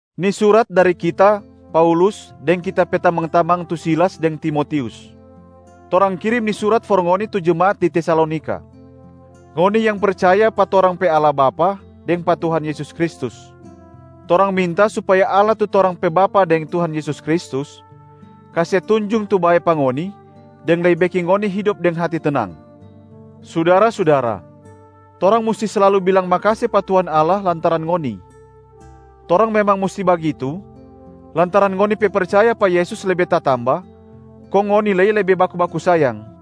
Ni surat dari kita, Paulus deng kita pe tamang-tamang tu Silas deng Timotius. Torang kirim ni surat for ngoni tu jemaat di Tesalonika. Ngoni yang percaya pa torang pe Allah Bapa deng pa Tuhan Yesus Kristus. Torang minta supaya Allah tu torang pe Bapa deng Tuhan Yesus Kristus kase tunjung tu bae pa ngoni deng lei beking ngoni hidop deng hati tenang. Sudara-sudara, torang musti slalu bilang makase pa Tuhan Allah lantaran ngoni. Torang memang musti bagitu lantaran ngoni pe percaya pa Yesus lebe tatamba, kong ngoni lei lebe baku-baku sayang.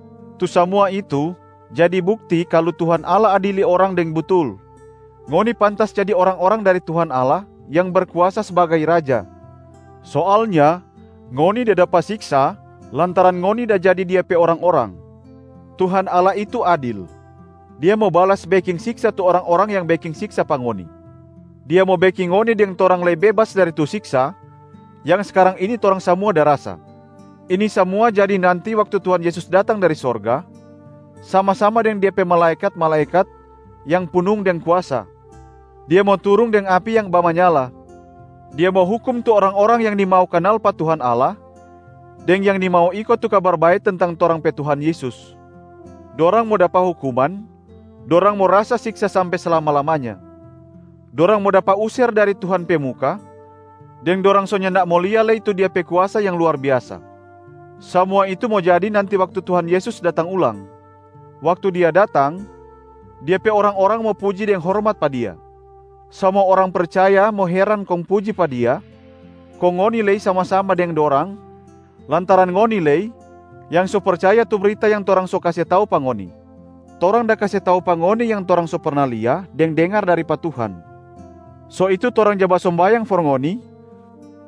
Tu samua itu jadi bukti kalu Tuhan Allah adili orang deng butul. Ngoni pantas jadi orang-orang dari Tuhan Allah yang Berkuasa sbagai Raja, soalnya ngoni da dapa siksa lantaran ngoni da jadi Dia pe orang-orang. Tuhan Allah itu adil, Dia mo balas beking siksa tu orang-orang yang beking siksa pa ngoni. Dia mo beking ngoni deng torang lei bebas dari tu siksa yang skarang ini torang samua da rasa. Ini samua jadi nanti waktu Tuhan Yesus datang dari sorga sama-sama deng Dia pe malaekat-malaekat yang punung deng kuasa. Dia mo turung deng api yang bamanyala. Dia mo hukum tu orang-orang yang nimau kanal pa Tuhan Allah deng yang nimau iko tu Kabar Bae tentang torang pe Tuhan Yesus. Dorang mo dapa hukuman, dorang mo rasa siksa sampe slama-lamanya. Dorang mo dapa user dari Tuhan pe muka, deng dorang so nyanda mo lia lei tu Dia pe kuasa yang luar biasa. Samua itu mo jadi nanti waktu Tuhan Yesus datang ulang. Waktu Dia datang, Dia pe orang-orang mo puji deng hormat pa Dia. Samua orang percaya mo heran kong puji pa Dia, kong ngoni lei mo sama-sama deng dorang lantaran ngoni lei yang so percaya tu brita yang torang so kase tau pa ngoni. Torang da kase tau pa ngoni yang torang so perna lia deng dengar dari pa Tuhan. So itu torang ja basombayang for ngoni,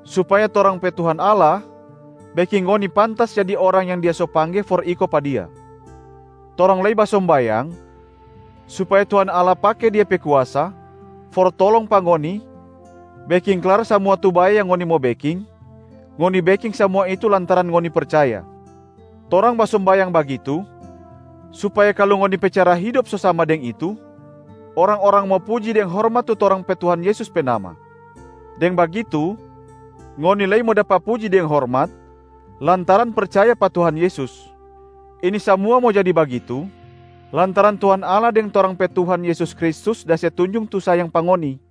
supaya torang pe Tuhan Allah beking ngoni pantas jadi orang yang Dia so pangge for iko pa Dia. Torang lei basombayang supaya Tuhan Allah pake Dia pe kuasa for tolong pa ngoni beking klar samua tu bae yang ngoni mo beking, ngoni beking samua itu lantaran ngoni percaya. Torang basombayang bagitu supaya kalu ngoni pe cara hidop so sama deng itu, orang-orang mo puji deng hormat tu torang pe Tuhan Yesus pe nama. Deng bagitu, ngoni lei mo dapa puji deng hormat lantaran percaya pa Tuhan Yesus. Ini samua mo jadi bagitu lantaran Tuhan Allah deng torang pe Tuhan Yesus Kristus da se tunjung tu sayang pa ngoni.